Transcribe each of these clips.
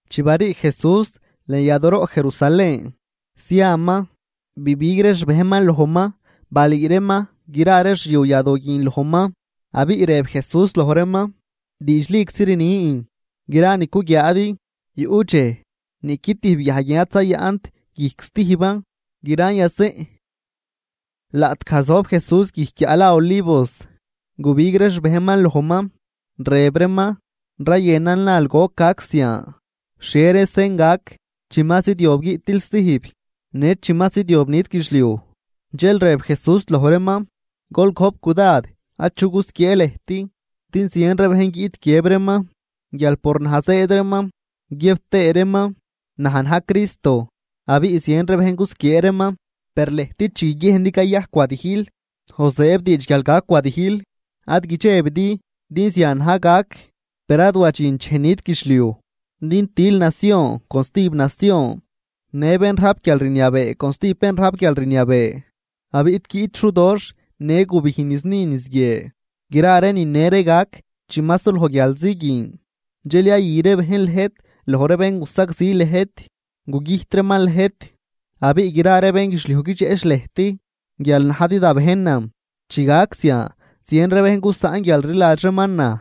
Chi barii Jesús lën yadooroꞌ Jerusalén, ziaman, bibig ree xbejnman lojman balüü reeman gra ree xyu yadoo guin lojman. Abiꞌ rëb Jesús loj reeman: ―Diidxliczi rnin, gra ni cuguiaadi yuꞌ dxej niꞌqui tijb guiaj guin ad zayaꞌnt guijc stijban, gran yazeꞌn. Laꞌtgaj zojb Jesús guijc guiaꞌ la Olivos, gubig ree xbejnman lojman, rëb reeman: ―Rayënan nal goc gac zian. ¿Xhie ree sen gac chi ma zidyob guiꞌtil stijb, në chi ma zidyob nit guidxliuj? Dxel rëb Jesús loj reeman: ―Gol gojp cudad achu gusquiee lëjt. Din zien ree bejn guiꞌt guiëb reeman guial por naj zëëd reeman, guiëb tëë reeman: “Naj na̱j Cristo”, abiꞌ zien bejn gusquiee reeman. Per lëjt chi guiguiejndi cayajc wadijl o zëëb diidx guial gac wadijl, ad guidxebidi din zian na̱j gac. Per ad wadxint dxej nit guidxliuj. Din til nacion con stijb nacion, në bén rajp guialrniabee con stijb bén rajp guialrniabee. Abiꞌ guiꞌt xudoxh në gubijn niz ni niz guie. Gra ree nine ree gac chi ma suloj guialzi guin. ’Dxel yayü ree bejn lëjt loj ree bén gusagzi lëjt, gugüjt reeman lëjt, abiꞌ gra ree bénguidxliuj guidxeꞌch lëjt guial najdi da bejnan. Chi gac zian zien ree bejn gusaꞌn guialrliladx reeman naj,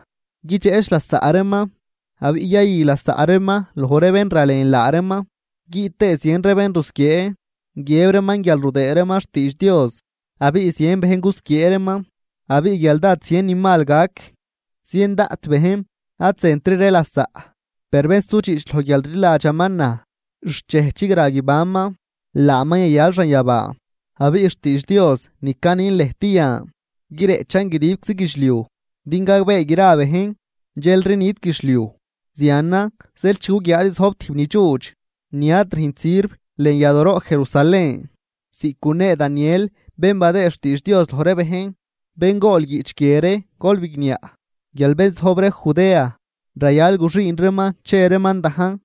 guidxeꞌch lasaꞌ reeman abiꞌ yayü lasaꞌ reeman loj ree bén ralen laa reeman. Guiꞌt tëë zien ree bén gusquiee, guiëb reeman guial rudëëd reeman xtiidx Dios, abiꞌ zien bejn gusquiee reeman. Abiꞌ guial dád zien ni mal gac, zien daꞌt bén ad zëntri ree lasaꞌ. Per bén sudxiꞌch loj guialrliladxaman naj, xt dxej chigra guibanman, laaman yayal xanyabaa. Abiꞌ xtiidx Dios ni canin lëjt yan guireꞌchan guidibczi guidxliuj din gagbee gra bejnan, dxelri nit guidxliuj. ’Zianan zeel chi guguiaadi zojb tijb ni dxuudx, ni ad rüjnt sirv lën yadooroꞌ Jerusalén, ziꞌc gunee Daniel bén badëë xtiidx Dios loj ree bejn (bén gool guiꞌch guie ree, gol bigniaꞌ), guial bén zojb ree Judea rayal guxüün reeman che reeman dajn.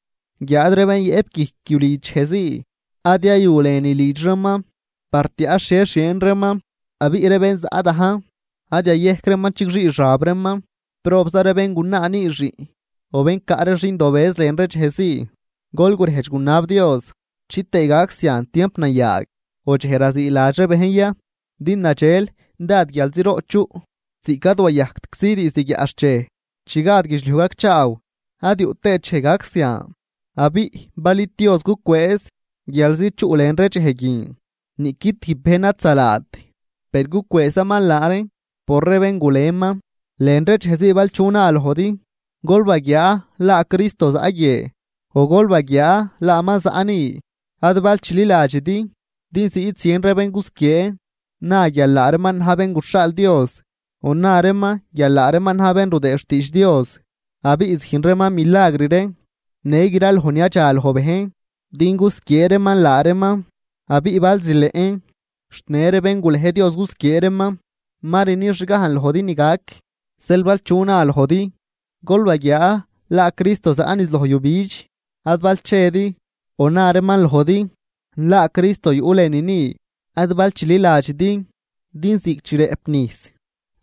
Guiáad ree bén yëꞌp guijc yulidx dxejzii, ad yayu lënülidx reeman par tiaꞌ xhie xieen reeman. Abiꞌ ree bén zaꞌ dajn, ad yayejc reeman chigxii xab reeman. ¡Probza ree béngunaa nüü xiꞌn o bén caꞌ ree xindobëz lën ree dxejzii! Gol gurejdx gunab Dios chitëë gac zian tiamp nayaag o dxej raziiladx ree bejn ya. Din nadxel dád guialziroꞌ chuꞌ, ziꞌc ad wayajctczi diizd guiaꞌxchej chi gad guidxliuj gacchaaw ad yuꞌ tëët dxej gac zian. Abiꞌ bal id Dios gucwëëz guialzi chuꞌ lën ree dxej guin, niꞌqui tijb bejn ad zalaat, per gucwëëzaman laa reen por ree bén guleman. ’Lën ree dxejzii bal chu na lojdi: “Gol baguiaa, laa Cristo zaꞌ guie”, o “Gol baguiaa laaman zaꞌ ni”, ad bal chililadxidi. Din ziꞌt zien ree bén gusquiee na guial laa reeman na̱j bén guxhaal Dios o na reeman guial laa reeman na̱j bén rudëëd xtiidx Dios. Abiꞌ züjn reeman milagr ree në graloj ni yadxaloj bejn din gusquiee reeman laa reeman, abiꞌ bal zileꞌn xt në ree bén gulej Dios gusquiee reeman. Ma rni xgajn lojdi ni gac. Zeel bal chu na lojdi: “Gol baguiaa laa Cristo zaꞌ niz loj yujbidx”, ad bal chedi o na reeman lojdi: “Laa Cristo yuꞌ lënü ni”, ad bal chililadxidi. Din ziꞌc chi rëꞌp nijs,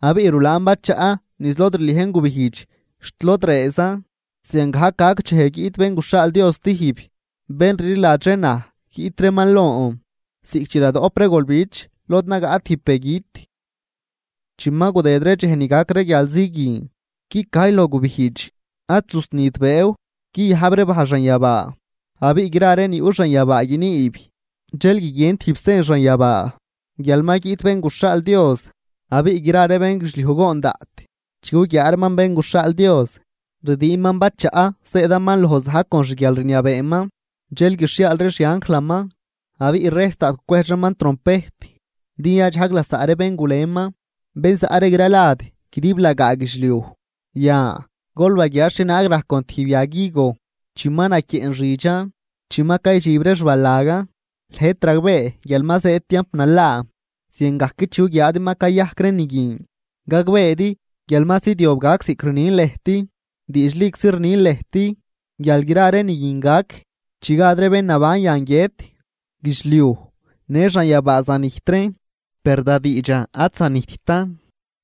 abiꞌ rulaan bachaꞌ niz lod rliejn gubijdx xt lod rëëzan, ziangajc gac dxej guiꞌt Bén guxhaal Dios stijb. Bén rliladx ree naj guiꞌt reeman lon, ziꞌc chi radoꞌp ree golbich lod nagaꞌ tijb begüt. ’Chi ma gudëd ree dxej ni gac ree guialzi guin, guicajy loj gubijdx, ad zusnit bëëw, guiyajb ree bajl xanyabaa abiꞌ gra ree ni yuꞌ xanyabaa guiniib. Dxel guiguien tijb sen xanyabaa guial ma guiꞌt Bén guxhaal Dios. Abiꞌ gra ree bénguidxliuj goon daꞌt chi guguiaa reeman Bén guxhaal Dios, rdiinman bachaꞌ zëëdaman loj za̱j con xguialrniabeeman. Dxel guixhiaal ree xianjlaman, abiꞌ rejs daꞌt gucwejdx reeman trompejt, din yadxajg lasaꞌ ree bén guleman, bén zaꞌ ree gralad guidiblagaa guidxliuj. ’Yan, gol baguiaa xhienaag rajc con tijb yag higo. Chi ma naquieꞌn xidxan, chi ma caydxib ree xbalagan, lëjt ragbee guial ma zëëd tiamp nalaa. Ziangajc chi guguiaadi ma cayajc ree ni guin, gagbeedi guial ma zidyob gac ziꞌc rnin lëjt. Diidxliczi rnin lëjt guial gra ree ni guin gac chi gad ree bén naban yan guiët. Guidxliuj në xanyabaa zanijt reen, per da diidxan ad zanijttan.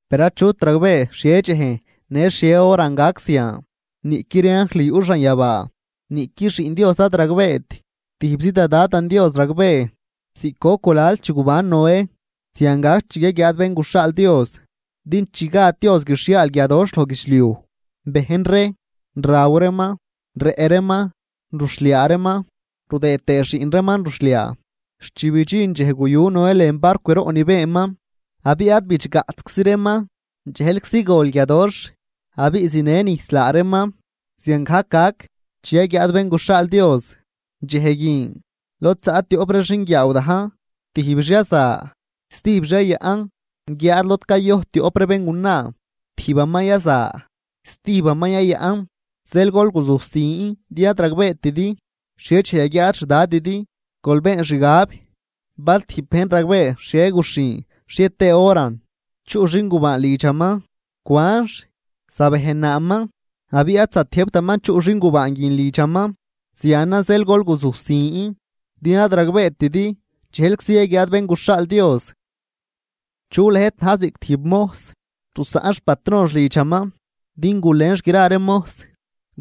’Per achut ragbee xhie dxejn në xhie horan gac zian, niꞌqui ree anjl yuꞌ xanyabaa, niꞌqui Xiꞌn Dios ad ragbeet. Tijbzi da Dadan Dios ragbee. ’Ziꞌc goc gulal chi guban Noé, zian gac chi yaguiaad Bén guxhaal Dios. Din chi gad Dios guixhiaal guiadoxh loj guidxliuj, bejn ree, raw reeman, rëꞌ reeman, ruxhliaa reeman, rudëë tëë xiꞌn reeman ruxhliaa, xt chi bidxin dxej guyu Noé lën barcwroꞌ ni beenman. Abiꞌ ad bidxgatczi reeman, dxejlczi gol guiadoxh abiꞌ zinë nijs laa reeman, ziangajc gac chi yaguiaad Bén guxhaal Dios. Dxej guin, lod zaꞌ tioꞌp ree xinguiaaw dajn, tijbix yaza, stijbix yayaꞌn. Guiáad lod cayojt tioꞌp ree béngunaa, tijbaman yaza, stijbaman yayaꞌn. ’Zeel gol guzujsin din ad ragbeetidi xhie dxej yaguiaad xDadidi. Gol been xgab, bal tijb bejn ragbee xhie guxhin xhie tëë horan chuꞌ xingubaan lidxaman cwanx, zabejnaaman abiꞌ ad zatiëjbtaman chuꞌ xingubaan guin lidxaman. Zianan zeel gol guzujsin, din ad ragbeetidi dxejlczi yaguiaad Bén guxhaal Dios. ’¿Chu lëjt na̱j ziꞌc tijb mojs rusaꞌn xpatronx lidxaman din gulenx gra ree mojs,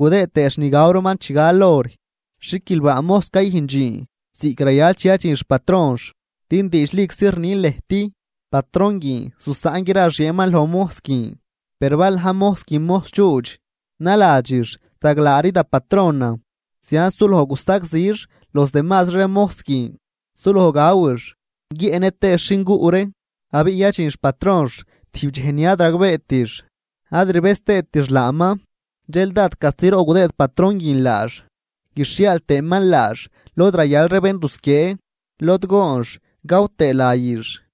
gudëë tëëx ni gaw reeman chi gal hor? Xiquilbaa mojs cayüjn dxiin ziꞌc rayal chi yadxin xpatronx. Din diidxliczi rnin lëjt, patron guin zusaꞌn gra xieenman loj mojs guin. Per bal na̱j mojs guin mojs dxuudx, naladxix: “Zaglaari da patronan.” Zianz suloj gusagzix los demazri ree mojs guin, suloj gawix, guiëꞌnë tëëx xinguꞌ ree. Abiꞌ yadxin xpatronx tijb dxej ni ad ragbeetix ad rbëz tëëtix laaman. Dxel dád castiroꞌ gudëëd patron guin laax, guixhiaal tëëman laax lod rayal ree bén rusquiee, lod goonx gaw tëë layix.